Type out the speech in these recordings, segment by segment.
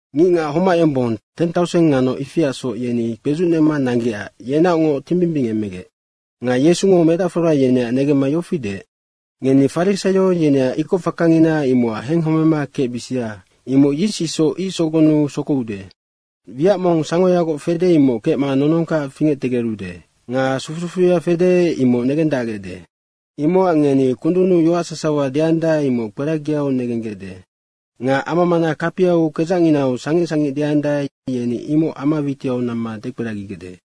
Ngicngac homac yombong, teng tauseng nga noc ifiacsoc yeni kpezucnema nanggecac yenaocngoc timbimbingemegec. Nga Yesungo medacfora, yeneac negemma yofi deec, “Ngeni farisaio yeneac ikoc fakangina imocac henghomema kecbisia, imoc yis isoc ic sogonnu sokoude. Wiac mong sangoyagoc fede, imoc kecma nonongkac fingectegerude nga sufu sufuya fede, imoc negendacgecde. Imocac ngeni kundunnu yoac sasawa deandae, imoc kperagiau negenggecde nga ama mana kapiau kedzacnginau sangic sangic deandae, yeni imoc ama witiau namma dekperagigecde.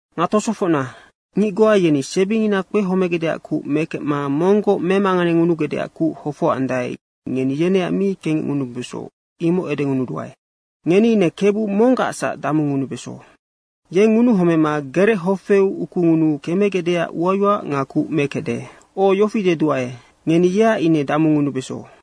Nga tosofocna, ngic goa yeni sebingina kpehomegecdeac kuc mekecma monggoc memanganengunugecdeac kuc hofocandae, ngeni yeneac mi kengecngunubeso, imoc edengunuduae. Ngeni ine Kebu monggacsac damungunubeso. Yeng ngunuhomema gerechofeu ukungunuu kemegecdeac uayoac nga kuc mekecde. O, yofi deduae, ngeni yeac ine damungunubeso.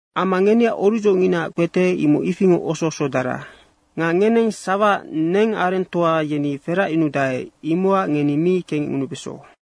Amma ngeneac orucdzongina kpete, imoc ifingoc oso osodara. Nga ngeneng sawaac nengarengtoa yeni feracyunudae, imocac ngeni mi kengecngunubeso.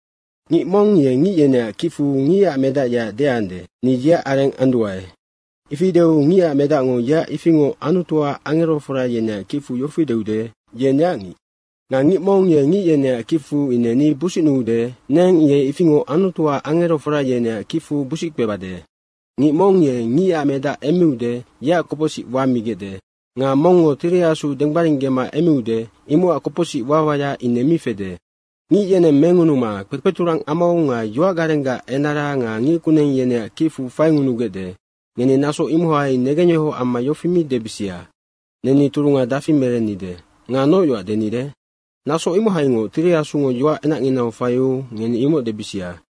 Ngic mong ye ngic yeneac kicfu Ngicac Medac yeac deande, ‘Ni yeac areng anduae.’ ifi deu Ngicac Medacngo yeac ifingoc Anutuac angerofora yeneac kicfu yofi deude, ‘Ye neac ngic.’ Nga ngic mong ye ngic yeneac kicfu ine ni busicnuude, neng ye ifingoc Anutuac angerofora yeneac kicfu busic kpebade. Ngic mong ye Ngicac Medac emmiude, yeac kopocsic wamigecde nga mongngo Tiri Asu denggbaringgema emmiude, imocac kopocsic wawaya ine mi fede. Ngic yeneng mengunuma kpekpeturang amau nga yoacgarenggac enara nga ngickuneng, yeneac kicfu faingunugecde, ngeni naso imohai negengyohoc amma yofi mi debisia, ‘Neni turunga dafi merennide nga noc yoac denide?’ Naso imohaingoc Tiri Asungo yoac enacnginau faiu ngeni imoc debisia.”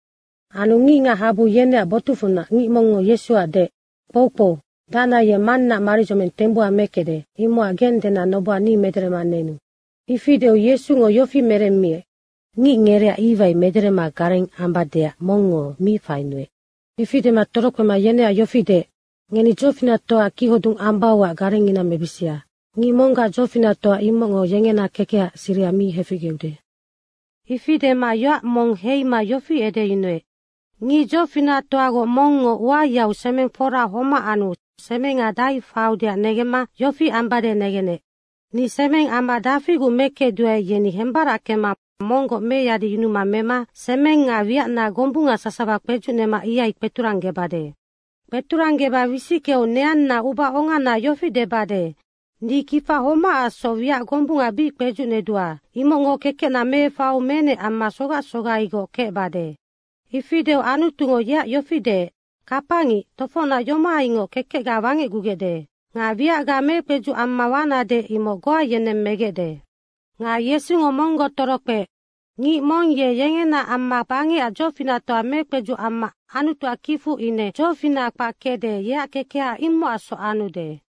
Anu ngicngac habu yeneac botucfunac ngic mongngo Yesuac deec, “Kpoukpou, dacna ye mannaac maridzoming tembuha mekecde, imocac geng dena noboha ni mederema nenu.” Ifi deu Yesungo yofi meremmiec, “Ngic, ngereac iwai mederema gareng ambadeac mongngo mi fainuec.” Ifi dema torokpema yeneac yofi deec, “Ngeni dzofinactoaac kichodung ambauac garengngina mebisia. Ngic monggac dzofinactoa, imocngo yengena kekehaac siriha mi heficgeude.” Ifi dema yoac mong heima yofi edeyunuec, “Ngic dzofinactoagoc mongngo uayau semeng fora homac anu semenga dahai faiudeac negengemema yofi ambade negenec, ‘Ni semengama dafiguc mekecduae, yeni hembarackema monggoc meyadiyunuma mema semeng nga wiacna gombunga sasawa kpedzucnema ihai kpeturanggebade. Kpeturanggeba wisickeu neanna ubaonganaac yofi debade, ni kifa homacacsoc wiac gombunga bic kpedzucnedua, imocngo kekecna meefaiu menec amma sogac sogaigoc kecbade.’ Ifi deu Anutungo yeac yofi deec, ‘Kapangic, tofocnac yomohaingoc kekecga wangecgugecde. Nga wiacga mekpedzuc amma wanade, imoc goa yeneng megecde.’” Nga Yesungo monggoc torokpeec, “Ngic mong ye yengenaac amma bangecac dzofinactoa mekpedzuc amma Anutuac kicfu ine dzofinaha kpac kecde, yeac kekeha imocacsoc anude.”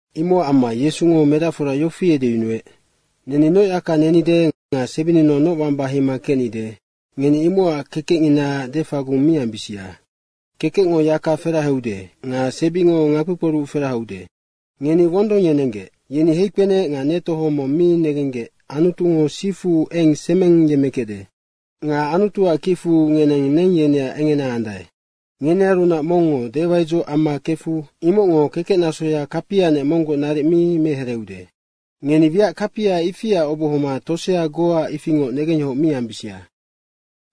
Imocac amma Yesungo medacfora yofi edeyunuec, “Neni noc yaka nenide nga sebininau noc wamba heima kecni. Ngeni imocac kekecnginaac defagung mi ambisia. Kekecngo yaka ferahaude nga sebingo ngakpikporuc ferahaude. Ngeni wondong yenenggec. Yeni heikpenec nga netohong mong mi negenggec Anutungo sifu eng semeng yemmekecde. Nga Anutuac kicfu ngeneng neng yeneac engena andae. Ngenearunac mongngo dewaidzoc amma kefu imocngo kekecnasoya kapianec monggoc naric mi mehereeude. Ngeni wiac kapia ifiaac obohoma tosea goaac ifingoc negengyohoc mi ambisia.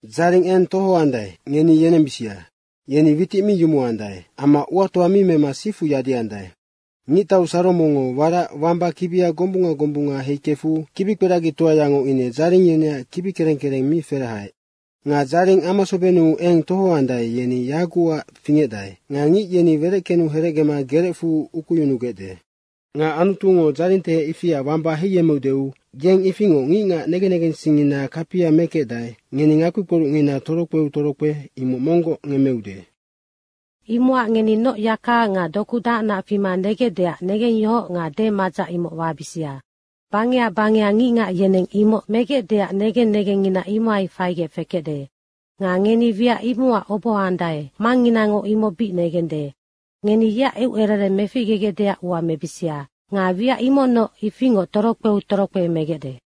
Dzaring eng tohoandae, ngeni yenembisia. Yeni witic mi yumuandae amma uatoa mi mema sifu yadiandae. Ngictau Saromongo warac wamba kibia gombunga gombunga heikefu kibikperagitoayango ine dzaring yeneac kibi kereng kereng mi ferahaec. Nga dzaring amasobennu eng tohoandae, yeni yagucac fingecdae nga ngic yeni wereckenu herecgema gerecfu ukuyunugecde. Nga Anutungo dzaringtehec ifia wamba heiyemmeudeu yeng ifingoc ngicngac negen negensingngina kapia mekecdae, ngeni ngakpikporucngina torokpeu torokpe imoc monggoc ngemmeude. Imocac ngeni noc yaka nga doku dahacnac fima negecdeac negengyohoc nga demadzac imoc wabisia. Nga bangeha bangeha ngicngac yeneng imoc megecdeac negen negengngina imohai faigec fekecde. Nga ngeni wiac imocac obohoandae, Mangnginango imoc bic negende. Ngeni yeac eucerereng meficgegecdeac ua mebisia nga wiac imocnoc ifingoc torokpeu torokpe megecde.”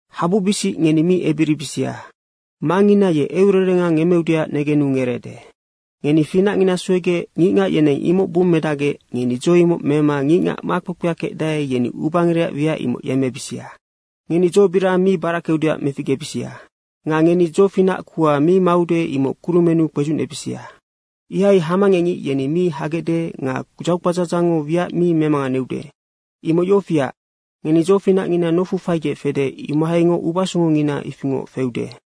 “Habubisic, ngeni mi ebiribisia. Mangngina ye eucererenga ngemmeudeac negenu ngereede. Ngeni finacngina suegec ngicngac yeneng imoc bummedacgec ngeni dzo imoc mema ngicngac makpekpea kecdae, yeni ubangerecac wiac imoc yemmebisia. Ngeni dzobirang mi barackeudeac meficgebisia. Nga ngeni dzofinac kuha mi maude, imoc kurumennu kpedzucnebisia. Ihai hamangecngic yeni mi hagecde nga dzaukpadzadzangngo wiac mi memanganeude. Imoc yofiac, ngeni dzofinacngina nofu faigec fede, imohaingoc ubasongongina ifingoc feude.”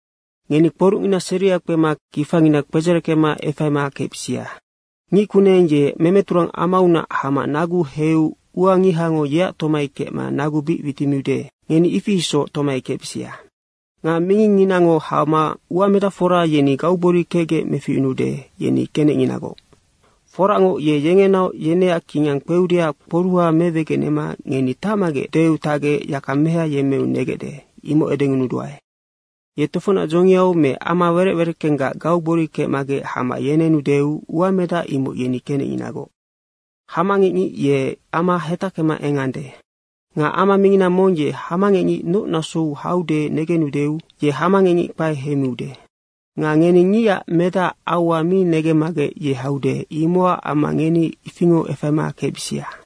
“Ngeni kporucngina seria kpema kifangina kpedzereckema efaima kecbisia. Ngic kuneng ye memeturang amaunac hama naguu heiu ua ngihango yeac tomai kecma nagu bic witimiude, ngeni ifi isoc tomai kecbisia. Nga mingingnginango hama uamedacfora yeni gaugbori kecgec meficyunuude, yeni kenecnginagoc. Foracngoc, ye yengenaoc yeneac kingang kpeudeac kporuha mewegenema ‘Ngeni tacmagec.’ deu tacgec yaka meha yemmeu negecde, imoc edengunuduae. Ye tofocnac dzongiau me ama werec wereckenggac gaugbori kecmagec hama yenenudeu uamedac imoc yeni kenecnginagoc. Hamangecngic ye ama hetackema engande. Nga ama mingina mong ye hamangecngic noc nasou haude negendeu ye hamangecngic kpae heimiude. Nga ngeni Ngicac Medacac aua mi negemmagec ye haude, imocac amma ngeni ifingoc efaima kecbisia.”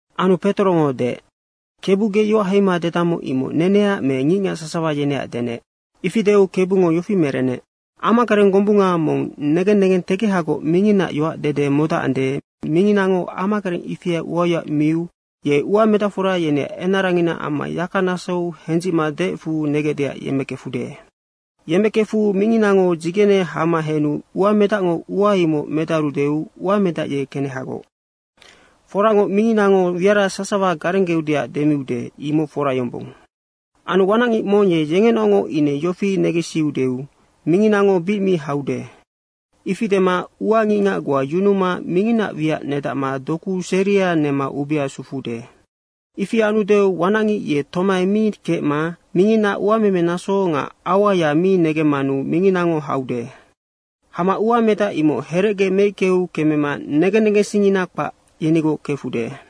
Anu Petorongo deec, “Kebu, ge yoac heima dedammoc, imoc neneac me ngicngac sasawa yeneac denec?” Ifi deu Kebungo yofi merenec, “Amagareng gombunga mong negen negentegehagoc minginaac yoac dede modacande, minginango amagareng ifia uayoac miu ye uamedacfora yeneac enarangina amma yaka nasou hendzicma deecfu negecdeac yemmekefude. Yemmekefu minginango dzigene hama henu uamedacngo ua imoc medarudeu uamedac ye kenehagoc. Foracngoc, minginango wiara sasawa garenggeudeac demiude, imoc fora yombong. Anu wanacngic mong ye yengenaocngoc ine yofi negensiudeu, ‘Minginnango bic mi haude.’ Ifi dema ua ngicngac goa yunuma minginaac wiac nedacma doku seria nema ubea sufuude. Ifi anudeu wanacngic ye tomai mi kecma minginaac uamemenaso nga auaya mi negemmanu minginango haude. Hama uamedac imoc herecge meickeu kemema negen negensingngina kpac, yenigoc kefude.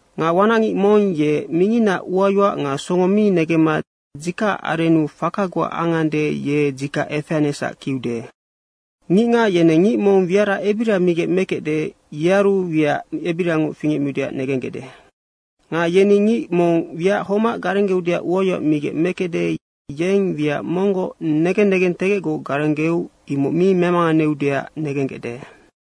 Nga wanacngic mong ye minginaac uayoac nga songo mi negemma dzikacac arennu faka goa angande, ye dzikac efeanecsac kiude. Ngicngac yeneng ngic mong wiac ebiria migec mekecde, yearu wiac ebiriangoc fingecmiudeac negenggecde. Nga yeni ngic mong wiac homac garenggeudeac uayoac migec mekecde, yeng wiac monggoc negen negengtegecgoc garenggeu imoc mi memanganeudeac negenggecde.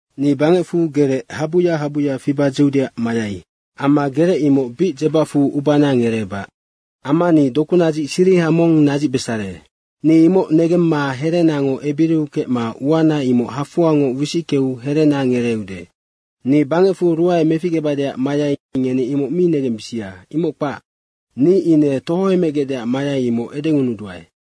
Ni bangecfu gerec habuya habuya fiba dzeudeac mayai. Amma gerec imoc bic dzebacfu ubana ngereebac. Amma ni dokunadzic siriha mong nadzicbesare. Ni imoc negemma herenango ebiriu kecma uana imoc hafoangoc wisickeu herena ngereeude. Ni bangecfu ruae meficgebadeac mayai, ngeni imoc mi negembisia, imoc kpac. Ni ine tohoemegecdeac mayai, imoc edengunuduae.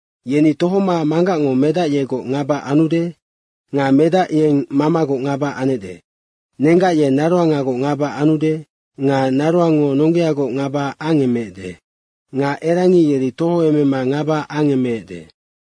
Yeni tohoma manggacngo medac yegoc ngaba anude nga medac yeng mamagoc ngaba anecde. Nenggac ye naroangagoc ngaba anude nga naroangngo nonggeagoc ngaba angemeecde. Nga erangi yeri tohoemema ngaba angemeecde.”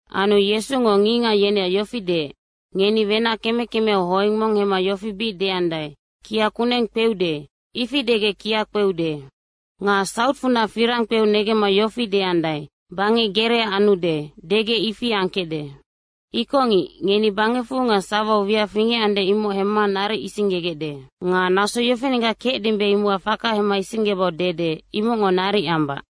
Anu Yesungo ngicngac yeneac yofi deec, “Ngeni wenac keme kemeau hoeng mong hemma yofi bic deandae, ‘Kia kuneng kpeude.’ ifi degec kia kpeude. Nga sautfunac firang kpeu negemma yofi deandae, ‘Bangec gerea anude.’ degec ifi angkecde. Ikocngic, ngeni bangecfu nga sawau wiac fingecande, imoc hemma naric isinggegecde. Nga naso yofinenggac kecdimbe, imocac faka hemma isinggebau dede imocngo naric ambac.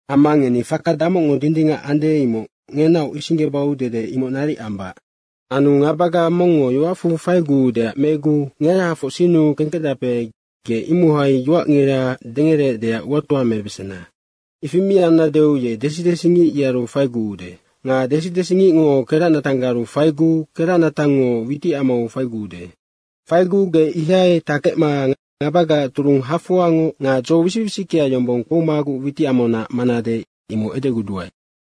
Amma ngeni faka damocngo dindingac ande, imoc ngenaoc isinggebau dede imoc naric ambac. Anu ngabaga mongngo yoacfu faiguudeac meguu ngerahafoc sinnu kengkecdape, ge imohai yoacngira dengereecdeac uatoa mebesena. Ifi mi annadeu ye desi desingic yearu faiguude. Nga desi desingicngo keracnatanggaru faiguu keracnatangngo witicamau faiguude. Faiguu ge ihai takecma ngabagaac turung hafoangoc nga dzo wisic wisickea yombong kpoumaguc witicamaunac manade, imoc edeguduae.”